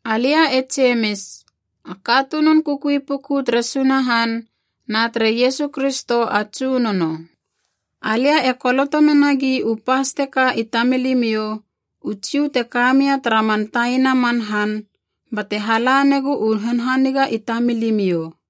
Alia e Jemis, a katunun kukui puku tere Sunahan na tere Iesu Kristo a Tsunono. Alia e koloto menagi u pas teka i tamilimiou u Jiu te ka mia tara man taina man han, bate hala negu u hanhaniga i tamilimiou.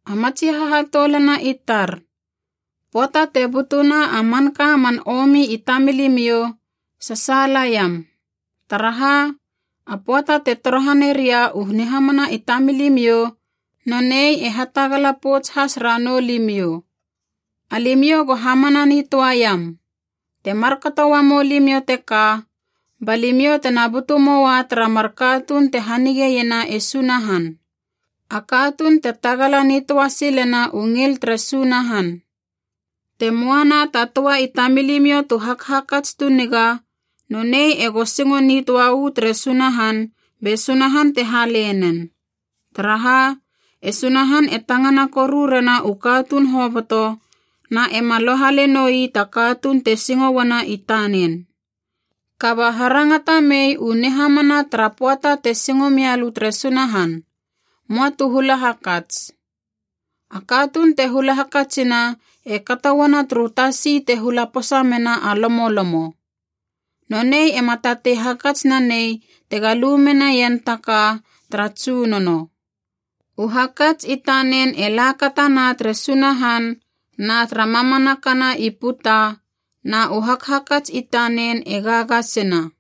A matsi hahatoulana i tar, pöata te butuna a manka man omi i tamilimiou, sasaalaiam. Taraha, a pöata te torohaneria u nihamana i tamilimiou nonei e hatagala pouts has ranou limiou. Alimiou go hamana nitöaiam. Te markato uamou limiou teka, ba limiou tena butu moua tara mar katuun te hanigeiena e Sunahan, a katuun te tagala nitöa silena u ngil tere Sunahan. Te möa na ta töa i tamilimiou tu hakhakats tu niga, nonei ego singo nitöa uu tere Sunahan be Sunahan te hale nen. Taraha, e Sunahan e tangana koru rena u katuun hoboto na ema lohale noi ta katuun te singo uana i tanen. Kaba harangata mei u nihamana tara pöata te singo mialö tere Sunahan, möa tu hula hakats. A katuun te hula hakatsina e kato uana turu tasi te hula posa mena a lomolomo. Nonei ema tatei hakats nanei tega lu menaien ta ka tara Tsunono. U hakats i tanen e lakatana tere Sunahan na tara mamanakana i puta, na u hakhakats i tanen e gagasina.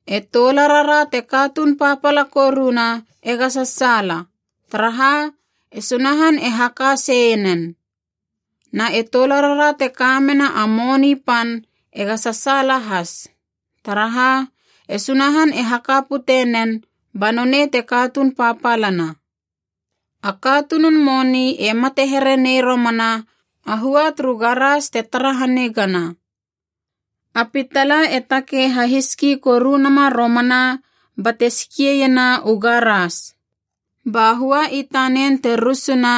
E toularara te katuun papala koruna ega sasaala, taraha e Sunahan e haka seienen. Na e toularara te ka mena a moni pan ega sasaala has, taraha e Sunahan e haka pute nen ba nonei te katuun papalana. A katunun moni e mate here nei romana a hua turu garas te tara hanigana. A pitala e takei hahiski koruna nama romana bate skieiena u garas. Ba hua i tanen te rusuna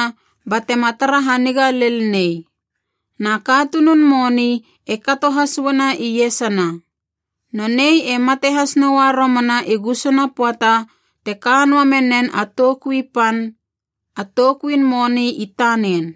batema tara haniga lel nei. Na katunun moni e kato has uana iesana. Nonei e mate has noa romana i gusuna pöata te ka noa menen a toukui pan, a toukuin moni i tanen.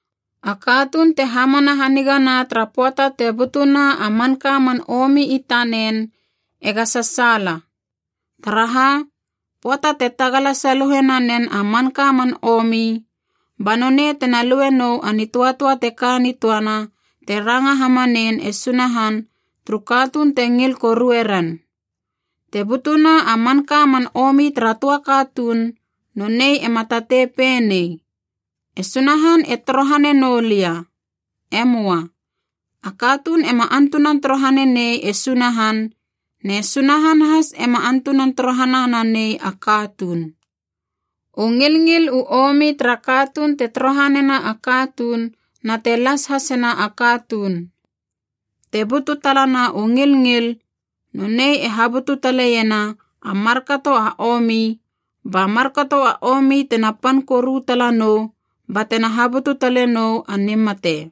A katuun te hamana hanigana tara pöata te butuna a manka man omi i tanen ega sasaala. Taraha, pöata te tagala saluhe nanen a manka man omi, ba nonei tena lue nou a nitöatöa te ka nitöana te ranga hamanein e Sunahan turu katuun te ngil korue ren. Te butuna a manka man omi tara töa katuun, nonei ema tatei pei nei, “E Sunahan e torohane noulia.” E möa. A katuun ema antunan torohane nei e Sunahan, ne Sunahan has ema antunan torohana nanei a katuun. U ngilngil u omi tara katuun te torohanena a katuun na te las hasena a katuun. Te butu talana u ngilngil, nonei e habutu taleiena a markato a omi, ba markato a omi tena pan koru tala nou batena habutu talenou a nimate.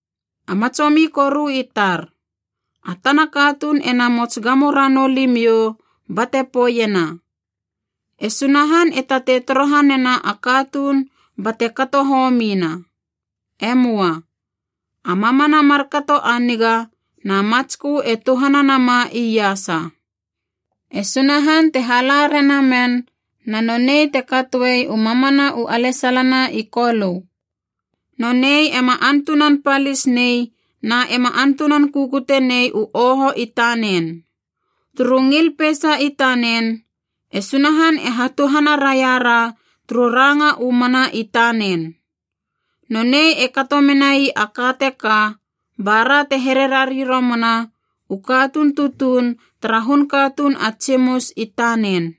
A matsomi koru i tar, a tana katuun e namots gamo ranou limiou bate poeiena, “E Sunahan e tatei torohanena a katuun bate kato homina.” E möa. A mamana markato a niga na matskö e tuhana nama iasa. E Sunahan te hala rena men, na nonei te katoe u mamana u alesalana i Kolö. Nonei ema antunan palis nei na ema antunan kukutenei u oho i tanen. Turu ngil peisa i tanen e Sunahan e hatuhana raiara turu ranga u mana i tanen. Nonei e kato menai a ka teka bara te here rari romana u katuun tutuun tara hun katuun a tsimus i tanen.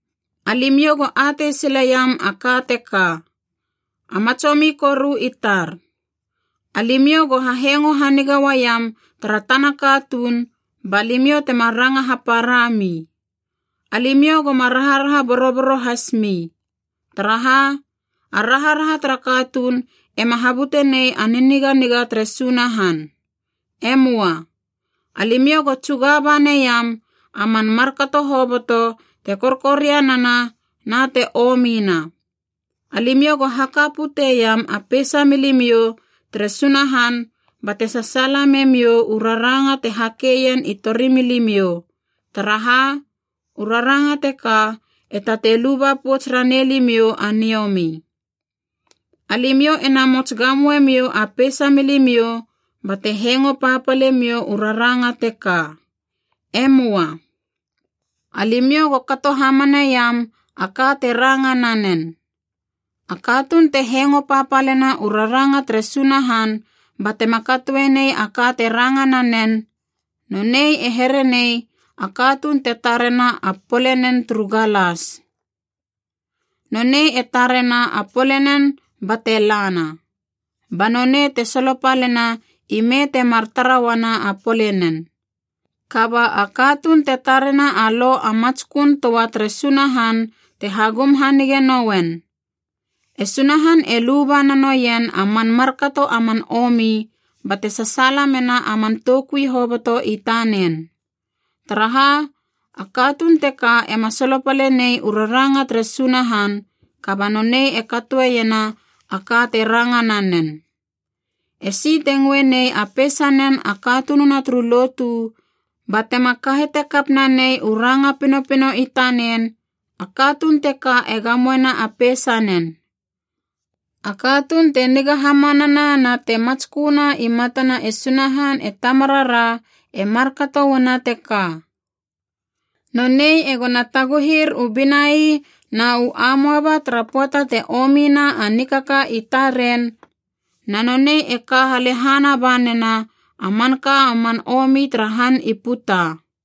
Alimiou go atei sileiam a ka teka, a matsomi koru i tar. Alimiou go hahengo haniga uaiam tara tana katuun ba limiou tema ranga haparami. Alimiou goma raharaha boroboro hasmi. Taraha, a raharaha tara katuun ema habutenei a niniganiga tere Sunahan. E möa. Alimiou go tsugaba neiam a man markato hoboto te korkorianana na te omina. Alimiou go haka puteiam a peisa milimiou tere Sunahan bate sasaala memiou u raranga te hakeien i torimilimiou, taraha u raranga teka e tatei luba pouts ranei limiou a niomi. Alimiou e namots gamoe miou a peisa milimiou bate hengo papalemiou u raranga teka. E möa. Alimiou go kato hamaneiam a ka te ranga nanen. A katuun te hengo papalena u raranga tere Sunahan batema katoe nei a ka te ranga nanen, nonei e here nei a katuun te tarena a polenen turu galas. Nonei e tarena a polenen bate lana, ba nonei te solopalena ime temar tara uana a polenen. Kaba a katuun te tarena a Lo a matskön töa tere Sunahan te hagum hanige nouen, e Sunahan e luba na noien a man markato a man omi bate sasaala mena a man toukui hoboto i tanen. Taraha, a katuun teka ema solopale nei u raranga tere Sunahan, kaba nonei e katoeiena a ka te ranga nanen. Esi te ngöe nei a peisanen a katununa turu lotu batema kahete kap nanei u ranga pinopino i tanen, a katuun teka e gamoena a peisanen. A katuun te niga hamanana na te matsköna i matana e Sunahan e Tamarara e markato uana teka: nonei egona taguhir u binai na u amoaba tara pöata te omina a nikaka i taren, na nonei e ka halehana ba nena a manka a man omi tara han i puta.